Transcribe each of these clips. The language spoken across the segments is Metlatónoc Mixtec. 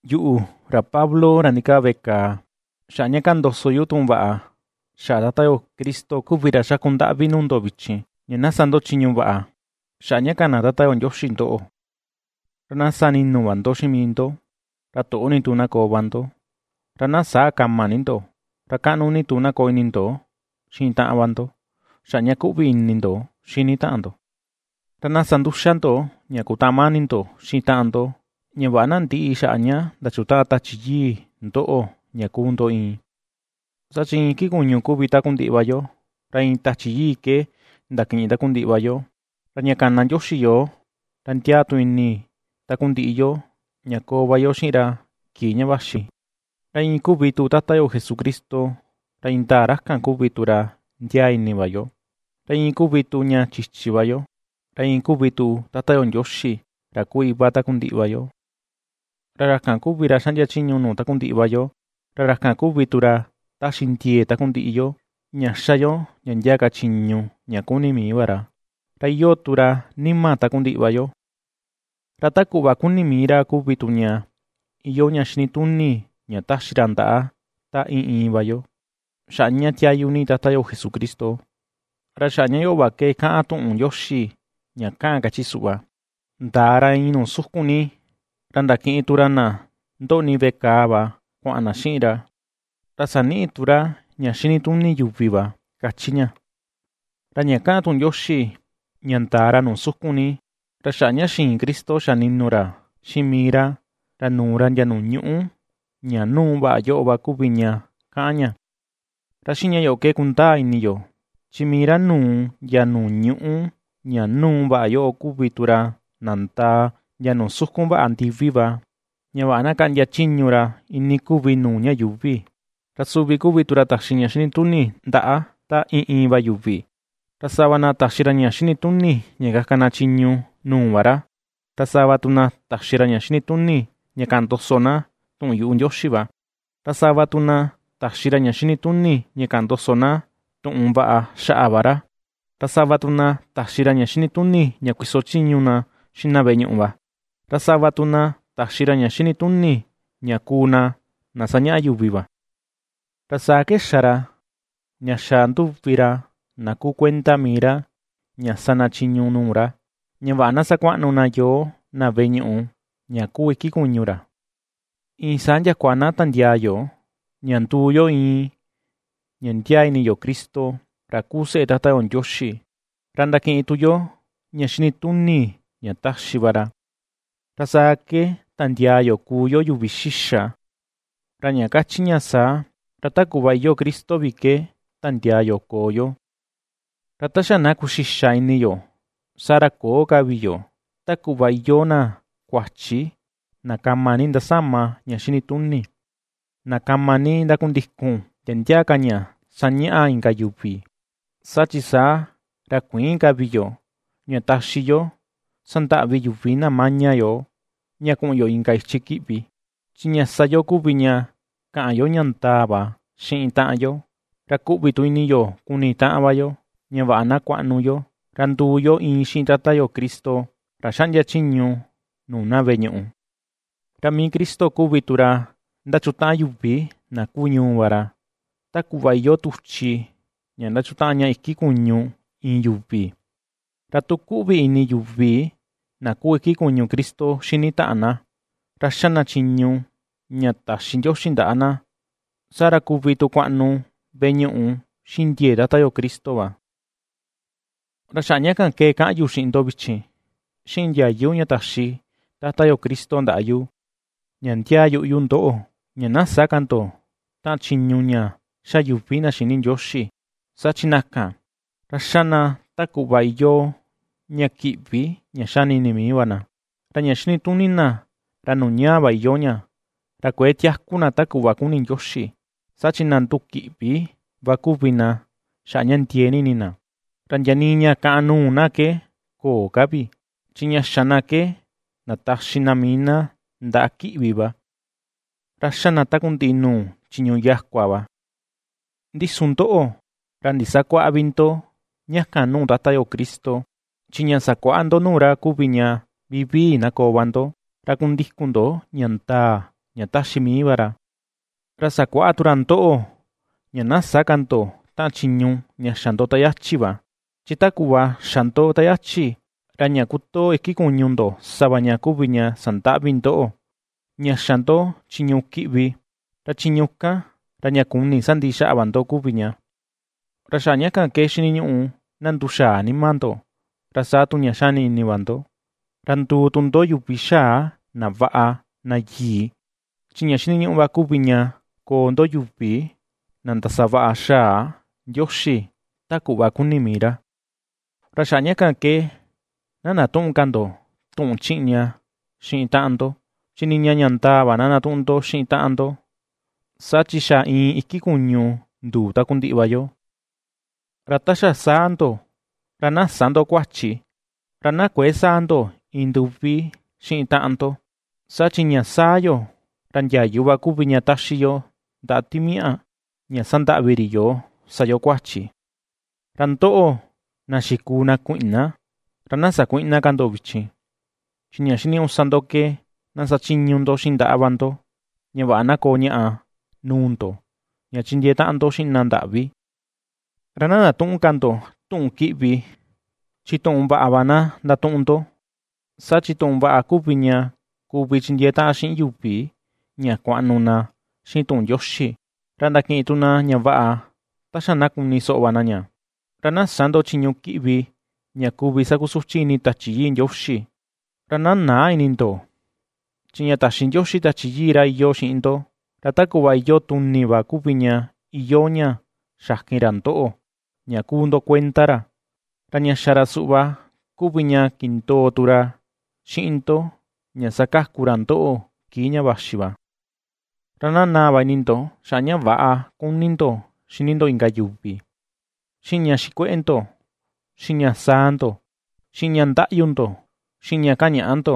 Yuꞌu, ra Pablo, ra ndikaa veꞌe kàà xaꞌa ña kaꞌan ndoso yu tuꞌun vaꞌa xaꞌa Tata yo Cristo kuvi ra xaku ndaꞌvi nuu ndo vichin, ña na sa ndo chiñu vaꞌa xaꞌa ña kana Tata yo Ndioxi ndoꞌo. Ra na sa ninu va ndo xiꞌin mii ndo, ra toꞌo ni tu na koo va ndo; ra na säa kama ni ndo, ra kaꞌnu ni tu na koo ini ndo xiꞌin taꞌan va ndo xaꞌa ña kuꞌvi ini ndo xini taꞌan ndo. Ra na sa nduxa ndo ña kutaꞌan mani ndo xiꞌin taꞌan ndo, ña vaꞌa na ndïꞌi xaꞌa ña ndachutaꞌan Tachi Yii ndoꞌo ña kuu ndo iin. Saa chi iin iki kuñu kuvi takundiꞌi va yo, ra iin Tachi Yii ke ndakiꞌin takundiꞌi va yo, ra ña kana Ndioxi yoo, ra ndiaa tu ini takundiꞌi yo ña koo va yo xiꞌin ra kii ña vaxi. Ra iin kuvi tu Tata yo Jesucristo, ra indaa ra kan kuvi tu ra ndiaa ini va yo, ra iin kuvi tu ña chichi va yo, ra iin kuvi tu Tata yo Ndioxi, ra kuu Iva takundiꞌi va yuvi. Ra ra kan kuvi ra ^xaꞌndia chiñu nuu takundiꞌi va yo, ra ra kan kuvi tu ra taxi ndiee takundiꞌi yo ña ^xa yo ndia ndia ka chiñu ña kuni mii va ra, ra iyoo tu ra nima takundiꞌi va yo. Ra ta kuꞌva kuni mii ra kuvi tu ña iyoo ña xinituni ña taxi ra ndaꞌa ta iin iin va yo, xaꞌa ña tiayu ni Tata yo Jesucristo. Ra xaꞌa ña yoꞌo va ke kaꞌan tuꞌun Ndioxi ña kaꞌan, kachi suꞌva: Ndaa ra iin nuu sukun ni, ra ndakiꞌin tu ra na ndoꞌni veꞌe kàà va kuaꞌan na xiꞌin ra, ra saniꞌi tu ra ña xinituni yuvi va, ^kachi ña. Ra ña kaꞌan tuꞌun Ndioxi, “ña ndaa ra nuu sukun ni”. Ra xaꞌa ña xiin Cristo xa ni̱nù ra xiꞌin mii ra, ra nuu ra ndia nùù ñúꞌu ña núu vaꞌa yoꞌo va kuvi ña, kaꞌan ña. Ra xiꞌin ña yoꞌo ke kundaa ini yo, chi mii ra nuu ndia nùù ñúꞌu ña núu vaꞌa yoꞌo kuvi tu ra nandaa, ndia nuu sukun vaꞌa ndiví va ña vaꞌa na kaꞌndia chiñu ra iinii kuvi nuu ña yuuvi. Ra suvi kuvi tu ra taxi ña xinituni ndaꞌa ta iin iin va yuvi, ra sava na taxi ra ña xinituni ña kaka na chiñu nuu va ra, ra sava tu na taxi ra ña xinituni ña kaꞌan ndoso na tuꞌun yuꞌu Ndioxi va, ra sava tu na taxi ra ña xinituni ña kaꞌan ndoso na tuꞌun vaꞌa xaꞌa va ra, ra sava tu na taxi ra ña xinituni ña kuiso chiñu na xiꞌin na veꞌe ñuꞌu va, ra sava tu na taxi ra ña xinituni ña kuu na, na ^sañaꞌa yuvi va. Ra saa ke xa ra ña xa nduvi ra na kuu kuenda mii ra ña sa na chiñu nuu ra, ña vaꞌa na sakuaꞌnu na yoo na veꞌe ñuꞌu ña kuu iki kuñu ra, iin saa ndiakua na tandiaa yo, ña nduu yo iin, ña ndiaa ini yo Cristo ra kuu seꞌe Tata yo Ndioxi, ra ndakiꞌin tu yo ña xinituni ña taxi va ra. Ra saa ke tandiaa yo kuu yo yuvi xixa, ra ña kachi ña saa, ra ta kuꞌva iyoo Cristo vi ke tandiaa yo koo yo. Ra ta xa na kuxixa ini yo, saa ra köo ka vi yo ta kuꞌva iyoo na kuachi na kama ni ndasama ña xinituni, na kama ni ndakundikun ndia ndia ka ña sañaꞌa inka yuvi. Saa chi, saa ra kuïin ka vi yo ña taxi yo sandaꞌvi yuvi na maña yoo, ña kuꞌun yo inka ichi kiꞌvi. Chi ña sa yo kuvi ña, kaꞌan yo ña ndaa va xiꞌin taꞌan yo, ra kuꞌvi tu ini yo kuni taꞌan va yo, ña vaꞌa na kuaꞌnu yo, ra nduu yo iin xiꞌin Tata yo Cristo, ra xaꞌndia chiñu nuu na veꞌe ñuꞌu. Ra mii Cristo kuvi tu ra ^ndachutaꞌan yuvi na kuu ñuu va ra, ta kuꞌva iyoo tuchi ña ndachutaꞌan ña iki kuñu iin yuvi. Ra tu kuꞌvi ini yuvi na kuu iki kuñu Cristo xini taꞌan na, ra ^xa na chiñu ña taxi Ndioxi ndaꞌa na, saa ra kuvi tu kuaꞌnu veꞌe ñuꞌu xiꞌin ndiee Tata yo Cristo va. Ra xaꞌa ña kan ke kaꞌan yu xiꞌin ndo vichin, xiꞌin ndiayu ña taxi Tata yo Cristo ndaꞌa yu: ña ndiaa yuꞌu yu ndoꞌo, ña na sä ka ndo taꞌan chiñu ña ^xa yuvi na xïni Ndioxi, saa chi na kan, ra ^xa na ta kuꞌva iyoo ña kiꞌvi, ña xani ini mii va na. Ra ña xinituni na ra nuu ñaa va iyoo ña. Ra kuëe tiaku na ta kuꞌva kuni Ndioxi, saa chi na ndukiꞌvi va kuvi na xaꞌa ña ndiee ni ini na. Ra ndia nii ña kàꞌàn nuu na ke köo ka vi, chi ña xa na ke ndataxi na mii na ndaꞌa ki̱ꞌvi va, ra ^xa na takundiꞌi nuu chiñu yakua va. Ndi su ndoꞌo, ra ndisakuäꞌa vi ndo ña kan nuu Tata yo Cristo. Chi ña sakuaꞌa ndo nuu ra kuvi ña vivii na koo va ndo, ra kundikun ndo ña ndaa ña ^taxi mii va ra. Ra sakuaꞌa tu ra ndoꞌo, ña na sä ka ndo taꞌan chiñu ña xa ndo ta yachi va, chi ta kuꞌva xa ndo ta yachi, ra ña kotoo iki kuñu ndo sa va ña kuvi ña sandaꞌvi ndoꞌo, ña xa ndo chiñu kiꞌvi, ra chiñu kan, ra ña kuni sandiꞌi xaꞌa va ndo kuvi ña. Ra xaꞌa ña ke xiniñuꞌu na nduxaa nima ndo, ra saa tu ña xani xini va ndo ra nduu tu ndo yuvi xaa, na vaꞌa, na yii, chi ña xiniñuꞌu va kuvi ña koo ndo yuvi na ndasavaꞌa xaa Ndioxi ta kuꞌva kuni mii ra. Ra xaꞌa ña kan ke, na ndatüꞌun ka ndo tuꞌun chiꞌña xiꞌin taꞌan ndo; chi niña ña ndaa va na ndatuꞌun ndo xiꞌin na taꞌan ndo, saa chi xa iin iki kuñu nduu takundiꞌi va yo. Ra ta xa saa ndo, ra na sä ndo kuachi, ra na kuëe saa ndo iin nduvi xiꞌin taꞌan ndo. Saa chi ña saa yo, ra ndiayu va kuvi ña taxi yo ndaꞌa timiaꞌa ña sandaꞌvi ri yoo sa yo kuachi. Ra ndoꞌo, na xikuu na kuiꞌna, ra na sakuïꞌna ka ndo vichin, chi ña xiniñuꞌu sa ndo ke na sachiñu ndo xiꞌin ndaꞌa va ndo, ña vaꞌa na koo ñaꞌa nuu ndo ña chindiee taꞌan ndo xiꞌin na ndaꞌvi. Ra na ndatüꞌun ka ndo tuꞌun kiꞌvi, chi tuꞌun vaꞌa va na ndatuꞌun ndo, saa chi tuꞌun vaꞌa kuvi ña kuvi chindiee taꞌan xiꞌin yuvi ña kuaꞌnu na xiꞌin tuꞌun Ndioxi, ra ndakiꞌin tu na ña vaꞌa ta xa na kuni soꞌo va na ña. Ra na sä ndo chiñu kiꞌvi ña kuvi sakusuchi ini Tachi Yii Ndioxi. Ra na näa ini ndo, chi ña taxi Ndioxi Tachi Yii ra iyoo xiꞌin ndo ra ta kuꞌva iyoo tuni va kuvi ña iyoo ña xakin ra ndoꞌo ña kuu ndo kuenda ra, ra ña xa ra suꞌva kuvi ña kindoo tu ra xiꞌin ndo ña sakaku ra ndoꞌo kii ña vaxi va. Ra na naa va ini ndo, xaꞌa ña väꞌa kuni ndo xini ndo inka yuvi, xiꞌin ña xikueꞌe ndo, xiꞌin ña saa ndo, xiꞌin ña ndaꞌyu ndo, xiꞌin ña kañaꞌa ndo,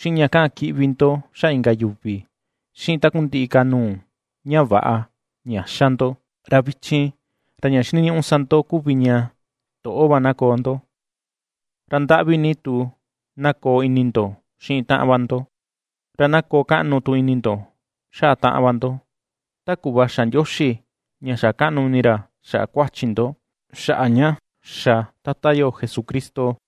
xiꞌin ña kaꞌan kiꞌvi ndo xaꞌa inka yuvi, xiꞌin takundiꞌi ka nuu ña väꞌa, ña ^xa ndo. Ra vichin, ra ña xiniñuꞌu sa ndo kuvi ña, toꞌo va na koo ndo, ra ndaꞌvi ni tu na koo ini ndo xiꞌin taꞌan va ndo, ra na koo kaꞌnu tu ini ndo xaꞌa taꞌan va ndo, ta kuꞌva xa Ndioxi, ña xa kaꞌnu ini ra xaꞌa kuachi ndo, xaꞌa ña xa Tata yo Jesucristo.